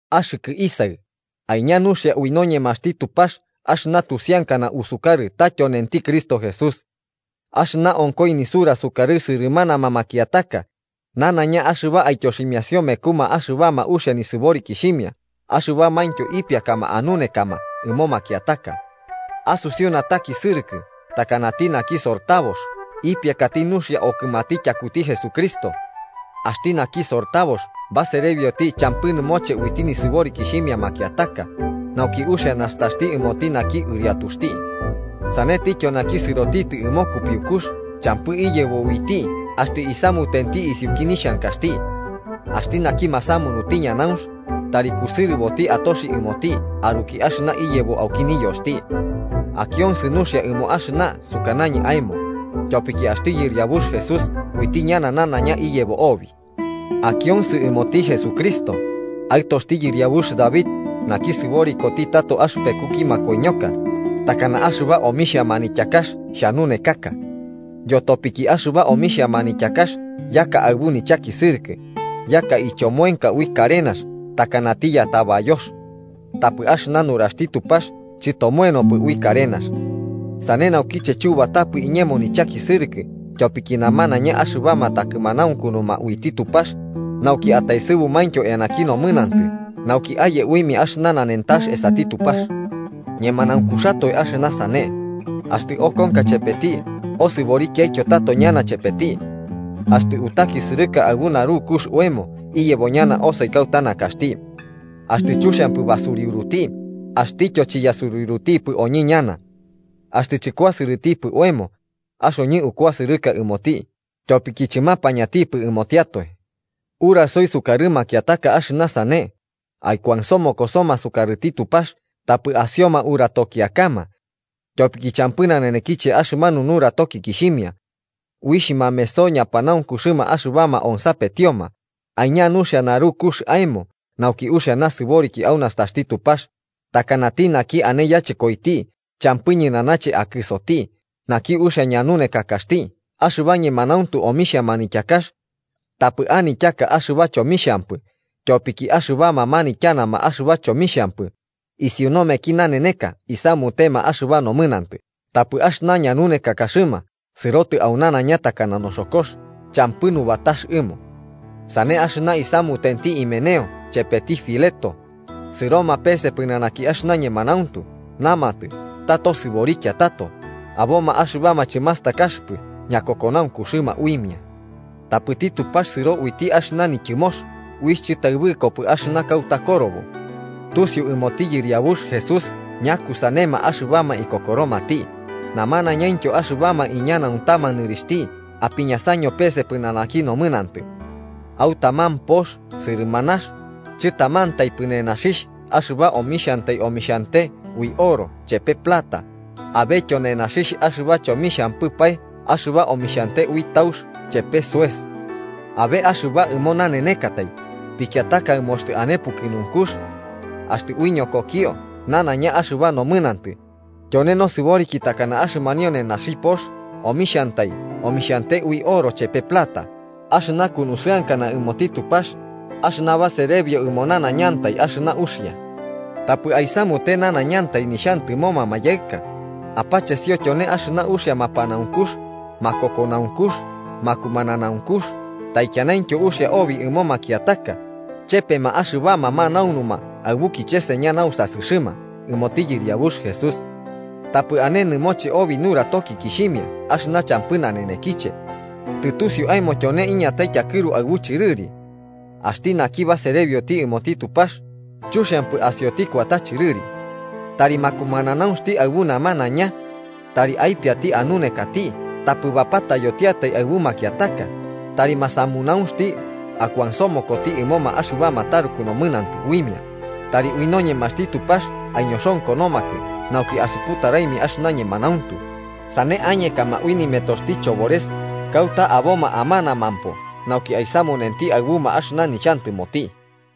Axɨkɨ isaɨ, aiña nuxia ui noñemaxti Tupax axɨna tusiankana asukarɨkɨ ta tyonenti Cristo Jesús. Axɨna onkoi nisura sukarɨ sɨrɨmanama makiataka, nanaiña axɨba aityoximiasio mekuma axɨbama uxia nisɨborikixhimia axɨbamaintyo ipiakama anunekama ɨmo makiataka. Asusiu natakisɨrɨkɨ takanati naki sortabox ipiakati nuxia okɨmati tyakuti Jesucristo. Axti naki sortabox baserebioti champɨ nɨmoche uiti nisɨborikixhimia makiataka, nauki uxia nastaxti ɨmoti naki ɨriatuxti. Sanentityo naki sɨrotitɨ ɨmo kupiukux champɨ iyebo uiti axtɨ isamutenti isiuki nixhankaxti. Axti naki masamunuti ñanaunx, tari kusɨrɨboti atoxi ɨmoti aruki axɨna iyebo auki niyoxti. Akionsɨ nuxia ɨmo axɨna sukanañɨ aemo, tyopiki axti Yɨriabux Jesús uiti ñana nanaiña iyebo obi. Akionsɨ ɨmoti Jesucristo, aɨtoxti yɨriabux David naki sɨboriko tato axɨpekuki makoiñoka, takana axɨba omixhia manityakax xhanunekaka. Yotopiki axɨba omixhia manityakax yaka aɨbu nichakisɨrɨkɨ, yaka ichomoenka ui karenax takanati yatabayox. Tapɨ axɨna nuraxti Tupax chɨtomoenopɨ ui karenax. Sane naukiche chubatapɨ iñemo nichakisɨrɨkɨ tyopiki namanaiña axɨbama takɨmanaunkunuma uiti Tupax, nauki ataesɨbumaintyo eanaki nomɨnantɨ nauki aye uimia axɨna nanentax esati Tupax. Ñemanaunkuxatoe axɨna sane: Axtɨ okonka chepeti osɨborikiaityo tato ñana chepeti. Axtɨ utakisɨrɨka aɨbu narukux oemo, iyebo ñana osoi kauta nakaxti. Axtɨ chuxiankapɨ basuriuruti, axtityo chiyasuriurutipɨ oñɨ ñana. Axtɨ chɨkuasɨrɨtipɨ oemo, axoñɨ ukuasɨrɨka ɨmoti, tyopiki chɨmapañantipɨ ɨmotiatoe. Urasoi sukarɨ makiataka axɨna sane, aikuansomokosoma sukarɨti Tupax tapɨ asioma uratokiakama. Tyopiki champɨ nanenekiche axɨmanu nuratokikixhimia. Uixh mameso ñapanaunkuxɨma axɨbama onsapetioma. Aiña nuxia narukux aemo nauki uxia nasɨboriki au nastaxti Tupax, takanati naki ane yachɨkoiti champɨ ñɨnanache akɨsoti, naki uxia ñanunekakaxti axɨba ñemanauntu omixhia manityakax. Tapɨ anityaka axɨba chomixhampɨ, tyopiki axɨbama manityanama axɨba chomixhampɨ, isiu nomeki naneneka isamutema axɨba nomɨnantɨ tapɨ axɨna ñanunekakaxɨma sɨrotɨ au nanaiña takana noxokox champɨ nubatax ɨmo. Sane axɨna isamutenti Himeneo chepeti Fileto, sɨroma pese pɨnanaki axɨna ñemanauntu namatɨ ta tosɨborikia tato, aboma axɨbama chɨmastakaxɨpɨ ñakokonaunkuxɨma uimia. Tapɨti Tupax sɨro uiti axɨna nityɨmox uixh chɨtaɨbɨkopɨ, axɨna kauta korobo: “Tusiu ɨmoti Yɨriabux Jesús ñakusanema axɨbama ikokoromati”, namanañaintyo axɨbama iñanuantama nɨrixhti apiñasaño pese pɨnanaki nomɨnantɨ. Au taman pox sɨrɨmanax, chɨtamantaipɨ nenaxixh axɨba omixhantai omixhante ui oro chepe plata, abetyo nenaxixh axɨba chomixhampɨpae axɨba omixhante ui taux chepe soes. Abe axɨba ɨmo nanenekatai, pikiataka ɨmo axtɨ ane pukɨnunkux. Axtɨ aiñokokio nanaiña axɨba nomɨnantɨ, tyone nasɨboriki takana axɨmanio nenaxi pox omixhantai omixhante ui oro chepe plata, axɨna kunusɨankana ɨmoti Tupax, axɨna baserebio ɨmo nanaiñantai axɨna uxia. Tapɨ aisamute nanaiñantai nixhantɨmoma mayaɨka, apachesio tyone axɨna uixia mapanaunkux, makokonaunkux, makumananaunkux taikianaintyo uxia obi ɨmo makiataka, chepema axɨbama manaunuma aɨbu kicheseña nausasɨxɨma ɨmoti Yɨriabux Jesús. Tapɨ ane nɨmoche obi nuratokikixhimia axɨna champɨ nanenekiche. Tɨtusiu aemo tyone iñatai tyakɨru aɨbu chɨrɨri. Axti naki baserebioti ɨmoti Tupax, chuxiampɨ asioti kuata chɨrɨri. Tari makumananaunxti aɨbu namanaiña. Tari aipiati anunekati, tapɨ bapatayotiatai aɨbu makiataka tari masamunaunxti akuansomokoti ɨmoma axɨbama taruku nomɨnantɨ uimia, tari ui noñemaxti Tupax aiñoxonkonomakɨ nauki asuputaraimia axɨna ñemanauntu sane añekama ui nimetoxti chobores kauta aboma amanama nauki aisamunenti aɨbuma axɨna nixhantɨmoti.